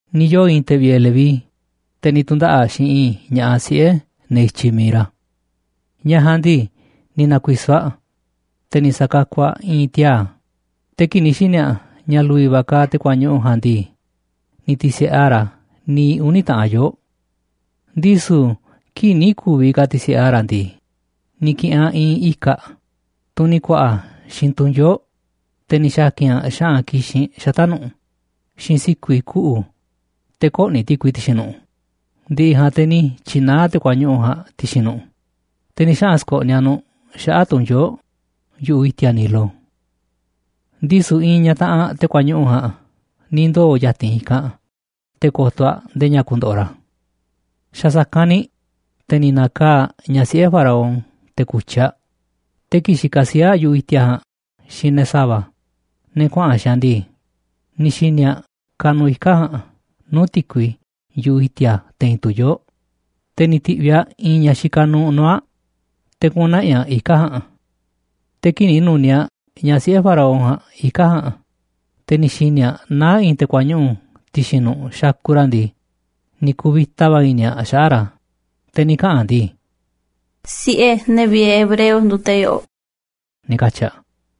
Ni̱ yoo̱ i̱i̱n te̱ vi̱ꞌe̱ Leví, te̱ ni̱ tu̱ndaꞌa̱ꞌ xiinꞌ i̱i̱n ña̱ꞌaꞌ siꞌe̱ ne̱ i̱tyiꞌ mi̱iꞌ ra̱. Ñaꞌ ja̱a̱nꞌ ndii, ni̱ na̱ku̱i̱so̱ aꞌ, te̱ ni̱ sa̱kakuꞌ aꞌ i̱i̱n tiaa̱. Te̱ kii̱ꞌ ni̱ xi̱ni̱ aꞌ ña̱ lu̱vi̱ va̱ kaaꞌ te̱ kuañuꞌu̱ ja̱a̱nꞌ ndii, ni̱ ti̱si̱ꞌe aꞌ ra̱ niiꞌ uni̱ taꞌan yoo̱ꞌ. Ndisu̱ kii̱ꞌ nï̱ ku̱vi̱ ka̱ ti̱si̱ꞌe aꞌ ra̱ ndii, ni̱ ki̱ꞌi̱n aꞌ i̱i̱n ika̱ꞌ, tunꞌ ni̱ ku̱a̱ꞌa̱ xiinꞌ tu̱nyoo̱ꞌ, te̱ ni̱ xa̱ki̱n aꞌ xa̱ꞌa̱n ki̱xinꞌ xata̱ꞌ nu̱ꞌ xiinꞌ si̱ku̱i̱ kuꞌu̱ te̱ kö̱ꞌni̱ ti̱kui ti̱xi̱n nu̱ꞌ. Ndi̱ꞌi̱ ja̱a̱nꞌ te̱ ni̱ tyi̱naá aꞌ te̱ kuañuꞌu̱ ja̱a̱nꞌ ti̱xi̱n nu̱ꞌ, te̱ ni̱ xaꞌa̱n sko̱ꞌniꞌ aꞌ nu̱ꞌ xaꞌa̱ꞌ tu̱nyoo̱ꞌ yu̱ꞌuꞌ i̱ti̱a̱ Nilo. Ndisu̱ i̱i̱n ñaꞌ taꞌanꞌ te̱ kuañuꞌu̱ ja̱a̱nꞌ ni̱ ndoo̱ ya̱ti̱n i̱kanꞌ te̱ ko̱to̱ aꞌ ndee ña̱ ku̱ndo̱ꞌo̱ ra̱. Xa̱ sa̱kanꞌ ni̱ te̱ ni̱ na̱kaa̱ꞌ ñaꞌ siꞌe̱ Faraón te̱ ku̱tyi̱ aꞌ, te̱ kii̱ꞌ xikaꞌ sii̱ꞌ aꞌ yu̱ꞌuꞌ i̱ti̱a̱ ja̱a̱nꞌ xiinꞌ ne̱ sa̱va̱, ne̱ kuaꞌa̱n xiinꞌ aꞌ ndii, ni̱ xi̱ni̱ aꞌ kanuꞌ ika̱ꞌ ja̱a̱nꞌ nuu̱ꞌ ti̱kui yu̱ꞌuꞌ i̱ti̱a̱ te̱i̱n tu̱nyoo̱ꞌ, te̱ ni̱ ti̱ꞌviꞌ aꞌ i̱i̱n ñaꞌ xikaꞌ nuuꞌ nuu̱ꞌ aꞌ te̱ kuꞌu̱n na̱ꞌi̱ aꞌ ika̱ꞌ ja̱a̱nꞌ. Te̱ kii̱ꞌ ni̱ nu̱niaꞌ ñaꞌ siꞌe̱ Faraón ja̱a̱nꞌ ika̱ꞌ ja̱a̱nꞌ, te̱ ni̱ xi̱ni̱ aꞌ naá i̱i̱n te̱ kuañuꞌu̱ ti̱xi̱n nu̱ꞌ xakuꞌ ra̱ ndii, ni̱ ku̱vi̱ta va̱ i̱ni̱ aꞌ xaꞌa̱ꞌ ra̱, te̱ ni̱ kaꞌa̱n aꞌ ndii: ―Siꞌe̱ ne̱ vi̱ꞌe̱ hebreo nduuꞌ te̱ yo̱ꞌo̱ꞌ ―ni̱ katyi̱ aꞌ.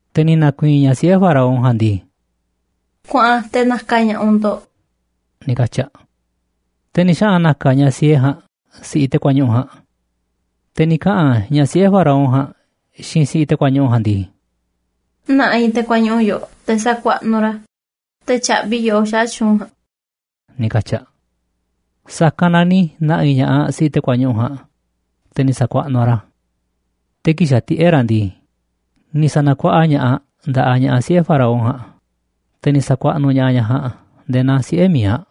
Te̱ ni̱ na̱ku̱i̱i̱n ñaꞌ siꞌe̱ Faraón ja̱a̱nꞌ ndii: ―Kuaꞌan te̱ na̱ka̱ ña̱ꞌaꞌ u̱nꞌ ndo̱ꞌ ―ni̱ katyi̱ aꞌ. Te̱ ni̱ xaꞌa̱n na̱ka̱ ñaꞌ siee ja̱a̱nꞌ si̱ꞌiꞌ te̱ kuañuꞌu̱ ja̱a̱nꞌ. Te̱ ni̱ kaꞌa̱n ñaꞌ siꞌe̱ Faraón ja̱a̱nꞌ xiinꞌ si̱ꞌiꞌ te̱ kuañuꞌu̱ ja̱a̱nꞌ ndii: ―Na̱ꞌi̱ te̱ kuañuꞌu̱ yoꞌoꞌ te̱ sa̱kuaꞌnuꞌ u̱nꞌ ra̱ te̱ tya̱ꞌvi̱ i̱ yoꞌó xaꞌa̱ꞌ tyu̱u̱n ja̱a̱nꞌ ―ni̱ katyi̱ aꞌ. Sa̱kanꞌ na ni̱ na̱ꞌi̱ ña̱ꞌaꞌ si̱ꞌiꞌ te̱ kuañuꞌu̱ ja̱a̱nꞌ, te̱ ni̱ sa̱kuaꞌnuꞌ aꞌ ra̱. Te̱ kii̱ꞌ xa̱tiꞌe̱ꞌ ra̱ ndii, ni̱ sa̱na̱kuaꞌa ña̱ꞌaꞌ aꞌ nda̱ꞌaꞌ ñaꞌ siꞌe̱ Faraón ja̱a̱nꞌ, te̱ ni̱ sa̱kuaꞌnuꞌ ña̱ꞌaꞌ ñaꞌ ja̱a̱nꞌ nde̱e̱ naa siꞌe̱ mi̱iꞌ aꞌ,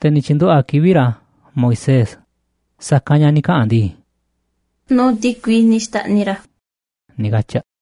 te̱ ni̱ tyi̱nduꞌu̱ꞌ aꞌ kivi̱ꞌ ra̱ Moisés, sa̱kanꞌ ña̱ ni̱ kaꞌa̱n aꞌ ndii: ―Nuu̱ꞌ ti̱kui ni̱ xta̱ꞌniꞌ i̱ ra̱ ―ni̱ katyi̱ aꞌ.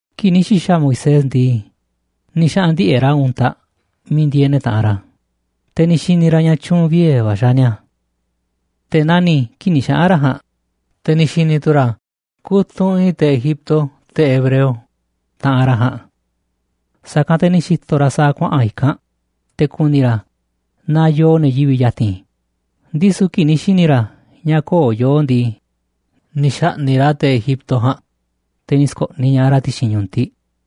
Kii̱ꞌ ni̱ xi̱xa̱ Moisés ndii, ni̱ xaꞌa̱n ndiꞌe̱ꞌ ra̱ untaꞌ miiꞌ ndieeꞌ ne̱ taꞌanꞌ ra̱, te̱ ni̱ xi̱ni̱ ra̱ ña̱ tyu̱u̱n viee̱ va̱ xaaꞌ ni̱a̱. Te̱ nani̱ kii̱ꞌ ni̱ xaꞌa̱n ra̱ ja̱a̱nꞌ, te̱ ni̱ xi̱ni̱ tu̱ ra̱ kutunꞌ i̱i̱n te̱ Egipto te̱ hebreo, taꞌanꞌ ra̱ ja̱a̱nꞌ. Sa̱kanꞌ te̱ ni̱ xi̱to̱ ra̱ sa̱a̱ kuaꞌa̱n i̱kanꞌ te̱ ku̱ni̱ ra̱ naaꞌ yoo ne̱ yivi̱ꞌ ya̱ti̱n, ndisu̱ kii̱ꞌ ni̱ xi̱ni̱ ra̱ ña̱ köo̱ꞌ yoo ndii, ni̱ xa̱ꞌni̱ꞌ ra̱ te̱ Egipto ja̱a̱nꞌ, te̱ ni̱ sko̱ꞌniꞌ ña̱ꞌaꞌ ra̱ ti̱xi̱n ñu̱tiꞌ.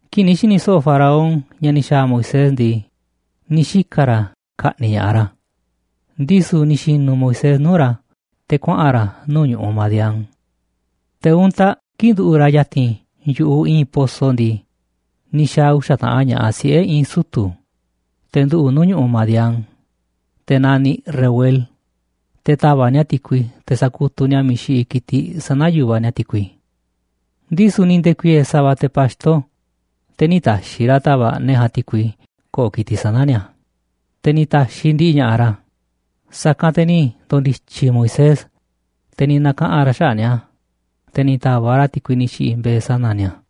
Kii̱ꞌ ni̱ xi̱ni̱ so̱ꞌo̱ Faraón ña̱ ni̱ xa̱a̱ Moisés ndii, ni̱ xika̱ ra̱ ka̱ꞌni̱ꞌ ña̱ꞌaꞌ ra̱, ndisu̱ ni̱ xi̱nu̱ Moisés nuu̱ꞌ ra̱ te̱ kuaꞌa̱n ra̱ nuu̱ꞌ ñu̱ꞌuꞌ Madián. Te̱ untaꞌ kii̱ꞌ nduꞌu̱ꞌ ra̱ ya̱ti̱n yu̱ꞌuꞌ i̱i̱n poso ndii, ni̱ xa̱a̱ uxa̱ taꞌan ña̱ꞌaꞌ siꞌe̱ i̱i̱n sutu̱, te̱ nduꞌu̱ꞌ nuu̱ꞌ ñu̱ꞌuꞌ Madián, te̱ naniꞌ Reuel, te̱ ta̱va̱ꞌ ni̱a̱ ti̱kui te̱ sa̱kutuꞌ ni̱a̱ miiꞌ xiꞌiꞌ ki̱tiꞌ sana̱ yu̱vaꞌ ni̱a̱ ti̱kui. Ndisu̱ ni̱ nde̱ku̱i̱e̱e̱ sa̱va̱ te̱ pa̱xto, te̱ nï̱ ta̱xi̱ ra̱ ta̱va̱ꞌ ne̱ ja̱a̱nꞌ ti̱kui ko̱ꞌo̱ ki̱tiꞌ sana̱ ni̱a̱, te̱ ni̱ ta̱xiꞌ ndiꞌiꞌ ña̱ꞌaꞌ ra̱. Sa̱kanꞌ te̱ ni̱ ndo̱ndi̱tyi̱ Moisés, te̱ ni̱ na̱kaꞌa̱n ra̱ xaꞌa̱ꞌ ni̱a̱, te̱ ni̱ ta̱va̱ꞌ ra̱ ti̱kui ni̱ xi̱ꞌi̱ mbe̱e̱ sana̱ ni̱a̱.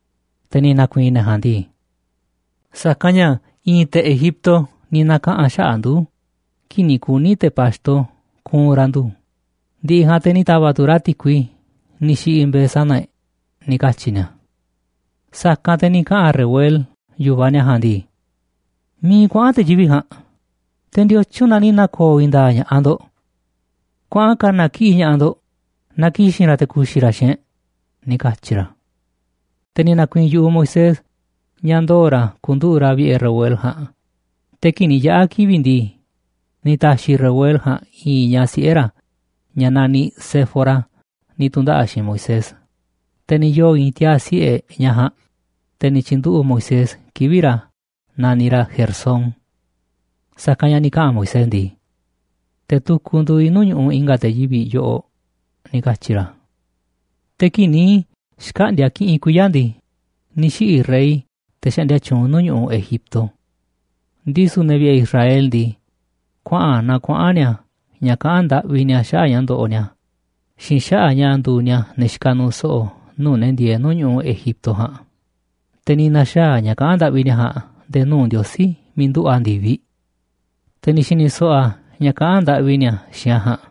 Te̱ ni̱ na̱ku̱i̱i̱n ne̱ ja̱a̱nꞌ ndii: ―Sa̱kanꞌ ña̱ i̱i̱n te̱ Egipto ni̱ na̱kaꞌa̱n xaꞌa̱ꞌ ndu̱ kii̱ꞌ ni̱ kuni̱ te̱ pa̱xto ku̱u̱n ra̱ ndu̱, ndi̱ꞌi̱ ja̱a̱nꞌ te̱ ni̱ ta̱va̱ꞌ tu̱ ra̱ ti̱kui ni̱ xi̱ꞌi̱ mbe̱e̱ sana̱ e̱ꞌ ―ni̱ katyi̱ ni̱a̱. Sa̱kanꞌ te̱ ni̱ kaꞌa̱n Reuel, yu̱vaꞌ ni̱a̱ ja̱a̱nꞌ ndii: ―¿Miiꞌ kuaꞌa̱n te̱ yivi̱ꞌ ja̱a̱nꞌ? Te̱ ¿ndiotyun na ni̱ na̱ko̱o̱ i̱i̱n nda̱a̱ꞌ ña̱ꞌaꞌ ndo̱ꞌ? Kuaꞌa̱n ka̱na̱ kiꞌi̱ꞌ ña̱ꞌaꞌ ndo̱ꞌ na ki̱xi̱n ra̱ te̱ ku̱xi̱ ra̱ xiinꞌ e̱ꞌ ―ni̱ katyi̱ ra̱. Te̱ ni̱ na̱ku̱i̱i̱n yu̱ꞌuꞌ Moisés ña̱ ndoo̱ ra̱ ku̱nduꞌu̱ꞌ ra̱ vi̱ꞌe̱ Reuel ja̱a̱nꞌ, te̱ kii̱ꞌ ni̱ yaꞌa̱ kivi̱ꞌ ndii, ni̱ ta̱xi̱ Reuel ja̱a̱nꞌ i̱i̱n ñaꞌ siꞌe̱ ra̱, ña̱ naniꞌ Séfora, ni̱ tu̱ndaꞌa̱ꞌ xiinꞌ Moisés. Te̱ ni̱ yoo̱ i̱i̱n tiaa̱ siꞌe̱ ñaꞌ ja̱a̱nꞌ, te̱ ni̱ tyi̱nduꞌu̱ꞌ Moisés kivi̱ꞌ ra̱ naniꞌ ra̱ Gersón. Sa̱kanꞌ ña̱ ni̱ kaꞌa̱n Moisés ndii: “Te̱ tukuꞌ nduuꞌ i̱ nuu̱ꞌ ñu̱ꞌuꞌ i̱nga̱ te̱ yivi̱ꞌ yoꞌoꞌ”, ni̱ katyi̱ ra̱. Te̱ kii̱ꞌ ni̱ xkaꞌndi̱a̱ kiꞌinꞌ kuiya̱ ndii, ni̱ xiꞌi̱ rey, te̱ xaꞌndia tyuunꞌ nuu̱ꞌ ñu̱ꞌuꞌ Egipto. Ndisu̱ ne̱ vi̱ꞌe̱ Israel ndii, kuaꞌa̱n naa kuaꞌa̱n ni̱a̱ ña̱ kaꞌán ndaꞌvi ni̱a̱ xaꞌa̱ꞌ ña̱ ndoꞌoꞌ ni̱a̱ xiinꞌ xaꞌa̱ꞌ ña̱ nduuꞌ ni̱a̱ ne̱ xikaꞌ nuuꞌ so̱ꞌo̱ nuu̱ꞌ ne̱ ndieeꞌ nuu̱ꞌ ñu̱ꞌuꞌ Egipto ja̱a̱nꞌ. Te̱ ni̱ na̱xaa̱ꞌ ña̱ꞌ kaꞌán ndaꞌvi ni̱a̱ ja̱a̱nꞌ nde̱e̱ nuu̱ꞌ Ndiosí miiꞌ nduꞌu̱ a̱ ndi̱viꞌ. Te̱ ni̱ xi̱ni̱ so̱ꞌo̱ a̱ ña̱ kaꞌán ndaꞌvi ni̱a̱ xiinꞌ a̱ ja̱a̱nꞌ,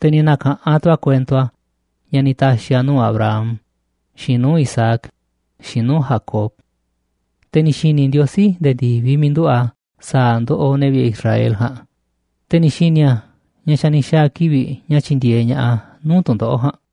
te̱ ni̱ na̱ka̱ꞌanꞌ tu̱ a̱ kuento a̱ ña̱ ni̱ ta̱xi̱ a̱ nuu̱ꞌ Abraham, xiinꞌ nuu̱ꞌ Isaac, xiinꞌ nuu̱ꞌ Jacob. Te̱ ni̱ xi̱ni̱ Ndiosí nde̱e̱ ndi̱viꞌ miiꞌ nduꞌu̱ a̱ sa̱a̱ ndoꞌoꞌ ne̱ vi̱ꞌe̱ Israel ja̱a̱nꞌ, te̱ ni̱ xi̱ni̱ a̱ ña̱ xa̱ ni̱ xa̱a̱ kivi̱ꞌ ña̱ tyi̱ndi̱e̱eꞌ ña̱ꞌaꞌ a̱ nuu̱ꞌ tu̱ndoꞌo̱ꞌ ja̱a̱nꞌ.